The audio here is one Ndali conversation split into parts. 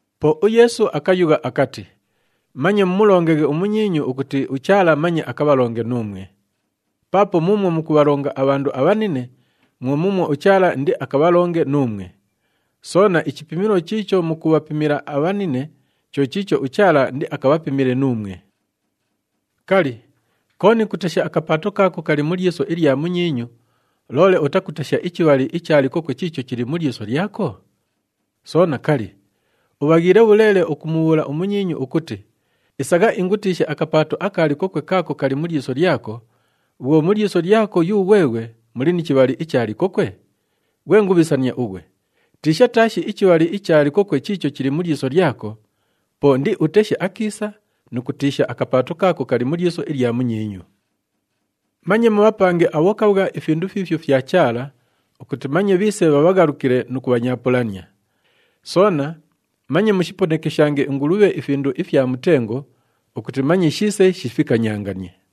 Po uYeesu akayugha akati, “Manye mumulongaghe umunyiinyu ukuti uChaala manye akabhalonge nuumwe. Paapo muumwo mukubhalonga abhandu abhanine, mwo muumwo uChaala indiakabhalonge nuumwe. Soona, ichipimilo chiicho mukubhapimila abhanine, cho chiicho uChaala indiakabhapimile nuumwe. “Kali, kooni kutesha akapaato kaako kali mu lyiso ilya munyiinyu, loole utakutesha ichibhali icha likokwe chiicho chili mu lyiso lyako? Soona, kali, ubhaghiile bhuleele ukumubhuula umunyiinyu ukuti, ‘Isagha ingutiishe akapaato aka likokwe kaako kali mu lyiso lyako,’ bhwo mu lyiso lyako yughweghwe muli ni chibhali icha likokwe? Ghwe ngubhisania ughwe! Tiisha taashi ichibhali icha likokwe chiicho chili mu lyiso lyako, po indiuteshe akiisa nu kutiisha akapaato kaako kali mu lyiso ilya munyiinyu! “Manye mubhapange abhokabhwa ifindu fiifyo fya Chaala ukuti manye bhiise bhabhaghalabhukile nu kubhanyaapulania. Soona manye mushiponekeshange ingulubhe ifindu ifya mutengo ukuti manye shiise shifikanyanganie.”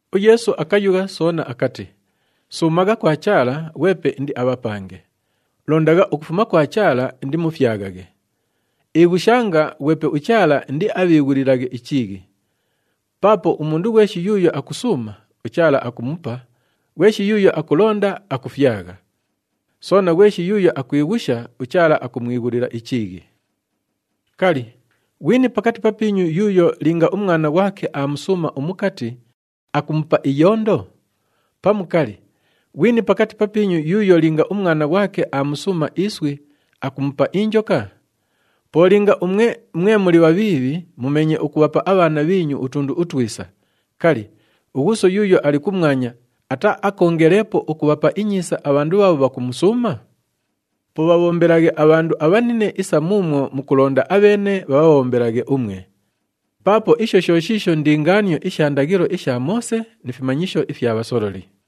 UYeesu akayugha soona akati, “Suumagha kwa Chaala, ghwepe indiabhapange. Londagha ukufuma kwa Chaala, indimufyaghaghe. Ighushanga, ghwepe uChaala indiabhiighulilaghe ichiighi. Paapo umundu ghweshi yuuyo akusuuma, uChaala akumupa, ghweshi yuuyo akulonda, akufyagha. Soona, ghweshi yuuyo akwighusha, uChaala akumwighulila ichiighi. “Kali, ghwini pakati papiinyu yuuyo linga umwana ghwake aamusuuma umukati, akumupa iyondo? Pamu kali, ghwini pakati papiinyu yuuyo linga umwana ghwake aamusuuma iswi, akumupa injoka? Po linga umwe, mwe muli bhabhiibhi mumeenye ukubhapa abhaana bhiinyu utundu utwisa, kali, uGhuuso yuuyo ali kumwanya ataaakoongeleepo ukubhapa inyiisa abhandu bhaabho bhakumusuuma? “Po bhabhombelaghe abhandu abhanine isa muumwo mukulonda abheene bhabhabhombelaghe umwe. Paapo isho sho shiisho ndingaanio isha ndaghilo isha Moose ni fimanyisho ifya bhasololi.”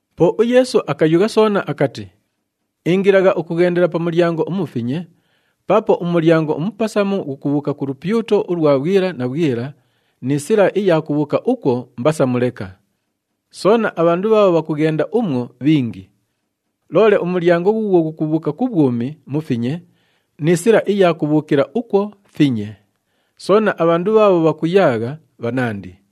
Po uYeesu akayugha soona akati, “Ingilagha ukughendela pa mulyango umufinye paapo umulyango umupasamu ghukubhuuka ku lupyuto ulwa bhwila na bhwila, ni sila iya kubhuuka ukwo mbasamu leka. Soona, abhandu bhaabho bhakughenda umwo, bhingi. Loole umulyango ghuughwo ghukubhuuka ku bhwumi mufinye, ni sila iya kubhuukila ukwo finye, soona abhandu bhaabho bhakuyaagha, bhanandi.”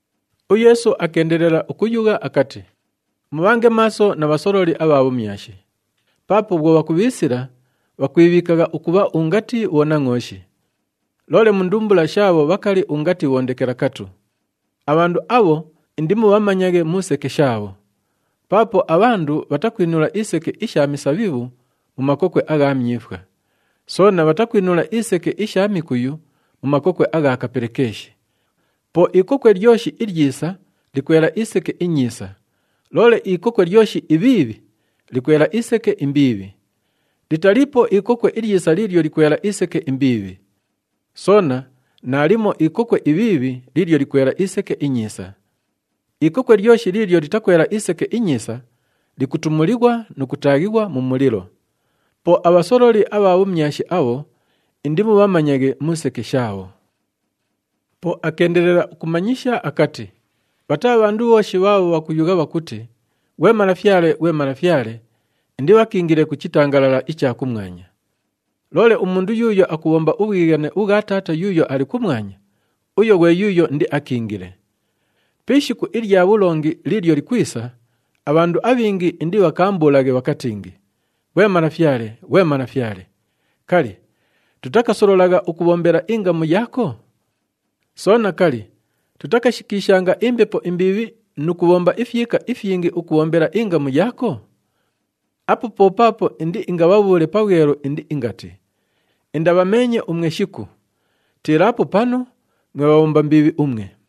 UYeesu akeendelela ukuyugha akati, “Mubhange maaso na bhasololi abha bhumyashi. Paapo bhwo bhakubhiisila, bhakwibhiikagha ukubha ungati bhonangʼooshi. Loole mu ndumbula shaabho bhakali ungati bhondekelakatu. Abhandu abho indimubhamanyaghe mu seke shaabho. Paapo abhandu bhatakwinula iseke isha misabhibhu mu makokwe agha myifwa. Soona bhatakwinula iseke isha mikuyu mu makokwe agha kapelekeeshi. Po ikokwe lyoshi ilyisa, likwela iseke inyiisa, loole ikokwe lyoshi ibhiibhi, likwela iseke imbiibhi. Litaliipo ikokwe ilyisa liilyo likwela iseke imbiibhi. Soona naalimo ikokwe ibhiibhi liilyo likwela iseke inyiisa. Ikokwe lyoshi liilyo litakwela iseke inyiisa, likutumulighwa nu kutaaghighwa mu mulilo. Po abhasololi abha bhumyashi abho, indimubhamanyaghe mu seke shaabho.” Po akeendelela ukumanyisha akati, “Bhataa bhandu bhooshi bhaabho bhakuyugha bhakuti, ‘Ghwe Malafyale, ghwe Malafyale,’ indibhakiingile ku chitangalala icha kumwanya. Loole umundu yuuyo akubhomba ubhwighane ubhwa Taata yuuyo ali kumwanya, uyo ghwe yuuyo indiakiingile. Pi ishiku ilya bhulongi liilyo likwisa, abhandu abhingi indibhakaambulaghe bhakatingi, ‘Ghwe Malafyale, ghwe Malafyale! Kali, tutakasololagha ukubhombela ingamu yaako? Soona, kali, tutakashikiishanga imbepo imbiibhi nu kubhomba ifyika ifyingi ukubhombela ingamu yaako?’ Apo po paapo indiingabhabhuule pabhwelu indiingati, ‘Indabhameenye umwe shiku! Tiilaapo panu, mwe bhabhomba mbiibhi umwe!’”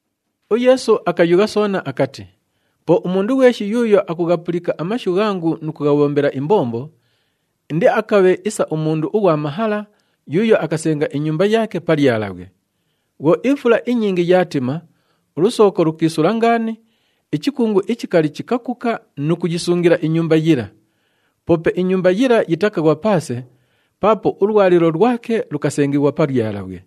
UYeesu akayugha soona akati, “Po umundu ghweshi yuuyo akughapulika amashu ghangu nu kughabhombela imbombo, indiakabhe isa umundu ughwa mahala yuuyo akasenga inyumba yaake pa lyalabhwe. Bhwo ifula inyingi yaatima, ulusooko lukiisula ngaani, ichikungu ichikali chikakuka nu kuyisungila inyumba yila. Poope inyumba yila yitakaghwa paase paapo ulwalilo lwake lukasengighwa pa lyalabhwe.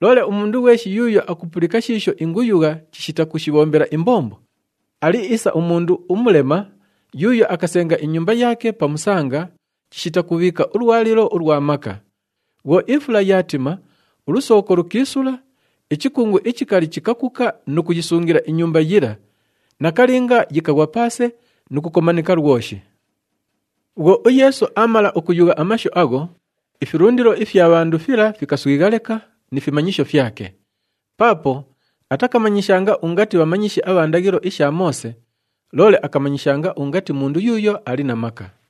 Loole umundu ghweshi yuuyo akupulika shiisho inguyugha chishita kushibhombela imbombo, ali isa umundu umulema yuuyo akasenga inyumba yaake pa musanga chishita kubhiika ulwalilo ulwa maka. Bhwo ifula yaatima, ulusooko lukiisula, ichikungu ichikali chikakuka nu kuyisungila inyumba yila, nakalinga yikaghwa paase nu kukomanika lwoshi.” Bhwo uYeesu aamala ukuyugha amashu agho, ifilundilo ifya bhandu fila fikaswigha leka ni fimanyisho fyake. Paapo atakamanyishanga ungati bhamanyishi abha ndaghilo isha Moose, loole akamanyishanga ungati mundu yuuyo ali na maka.